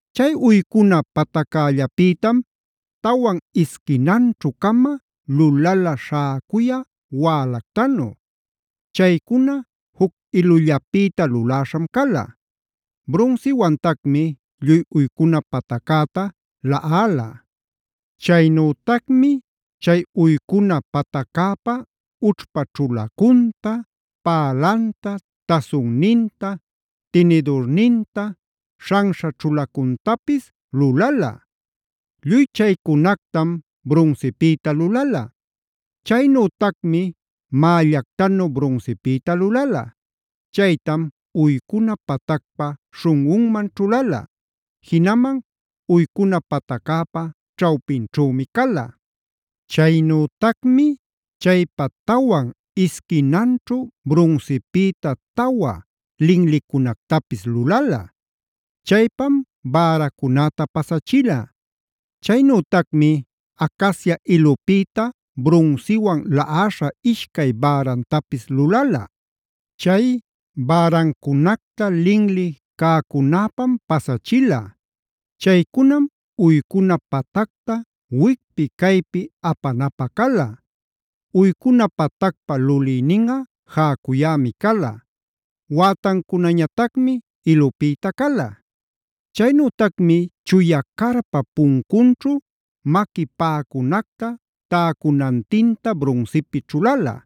Chay uycuna pataccällapïtam tawan isquinanćhu-cama lulala śhäcuyä wälactanu. Chaycuna juc ilullapïta luläśham cala. Brunsiwantacmi lluy uycuna pataccäta laꞌala. Chaynütacmi chay uycuna pataccäpa ućhpa ćhulacunta, pälanta, tasunninta, tinidurninta, śhanśha ćhulacuntapis lulala. Lluy chaycunactam brunsipïta lulala. Chaynütacmi mällactanu brunsipïta lulala. Chaytam uycuna patacpa śhunꞌunman ćhulala. Jinaman uycuna pataccäpa ćhawpinćhümi cala. Chaynütacmi chaypa tawan isquinanćhu brunsipïta tawa linlicunactapis lulala. Chaypam bäracunäta pasachila. Chaynütacmi acacia ilupïta brunsiwan laꞌaśha ishcay bärantapis lulala. Chay bärancunacta linli cäcunäpam pasachila. Chaycunam uycuna patacta wicpi caypi apanapä cala. Uycuna patacpa lulïninꞌa jäcuyämi cala. Wätancunañatacmi ilupïta cala. Chaynütacmi chuya carpap puncunćhu maqui paꞌacunacta täcunantinta brunsipi ćhulala.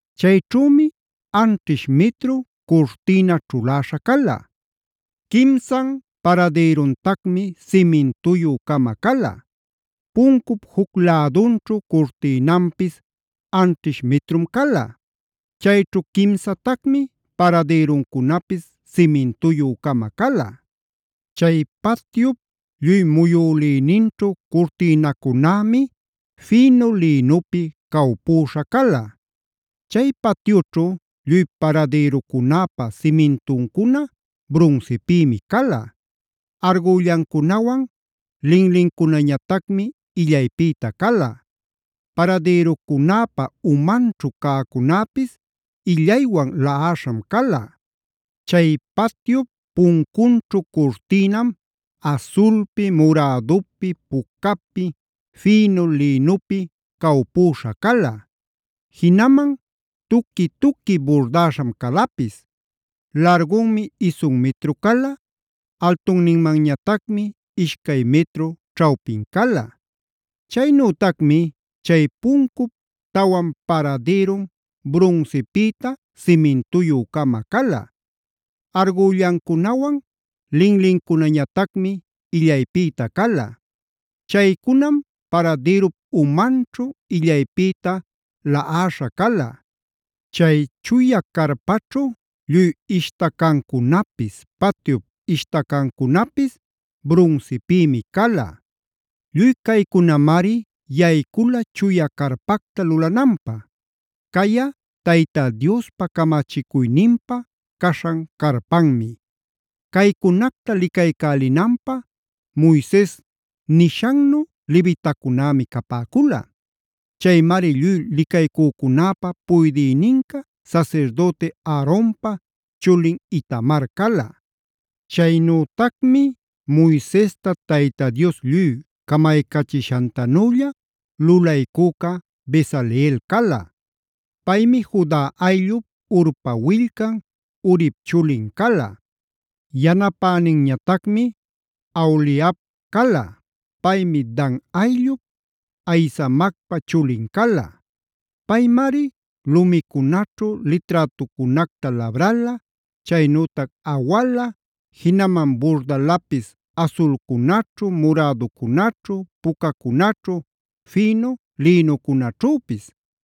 Chayćhümi anćhish mitru curtïna ćhuläśha cala. Quimsan paradïruntacmi simintuyü-cama cala. Puncup juc lädunćhu curtïnanpis anćhish mitrum cala. Chayćhu quimsatacmi paradïruncunapis simintuyü-cama cala. Chay patyup lluy muyülïninćhu curtïnacunämi fïnu lïnupi cawpüśha cala. Chay patyućhu lluy paradïrucunäpa simintuncuna brunsipïmi cala; argüllancunawan linlincunañatacmi illaypïta cala; paradïrucunäpa umanćhu cäcunäpis illaywan laꞌaśham cala. Chay patyup puncunćhu curtïnam asulpi, murädupi, pucapi, fïnu lïnupi cawpüśha cala. Jinaman tuqui-tuqui burdäśham calapis. Largunmi isun mitru cala; altunninmanñatacmi ishcay mitru ćhawpin cala. Chaynütacmi chay puncup tawan paradïrun brunsipïta simintuyü-cama cala. Argüllancunawan linlincunañatacmi illaypïta cala. Chaycunam paradïrup umanćhu illaypïta laꞌaśha cala. Chay chuya carpaćhu lluy ishtacancunapis, patyup ishtacancunapis brunsipïmi cala. Lluy caycunamari yaycula chuya carpacta lulananpä; cayꞌa Tayta Diospa camachicuyninpa caśhan carpanmi. Caycunacta licaycälinanpä Moises nishannu levitacunämi capäcula. Chaymari lluy licaycücunäpa puydïninca sasirdüti Aaronpa chulin Itamar cala. Chaynütacmi Moisesta Tayta Dios lluy camaycachishantanülla lulaycüca Bezaleel cala. Paymi Juda ayllup, Hurpa willcan, Urip chulin cala. Yanapäninñatacmi Aholiab cala. Paymi Dan ayllup, Ahisamacpa chulin cala. Paymari lumicunaćhu liträtucunacta labrala, chaynütac awala, jinaman burdalapis asulcunaćhu, muräducunaćhu, pucacunaćhu, fïnu lïnucunaćhüpis.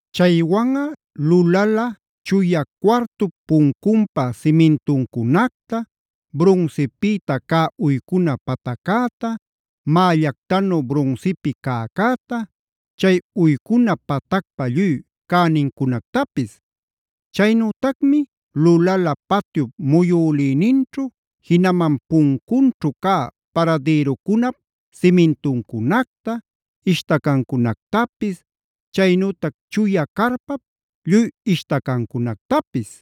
Chaywanꞌa lulala: chuya cuartup puncunpa simintuncunacta, brunsipïta cä uycuna pataccäta, mällactanu brunsipi cäcäta, chay uycuna patacpa lluy cänincunactapis. Chaynütacmi lulala patyup muyülïninćhu, jinaman puncunćhu cä paradïrucunap simintuncunacta, ishtacancunactapis, chaynütac chuya carpap lluy ishtacancunactapis.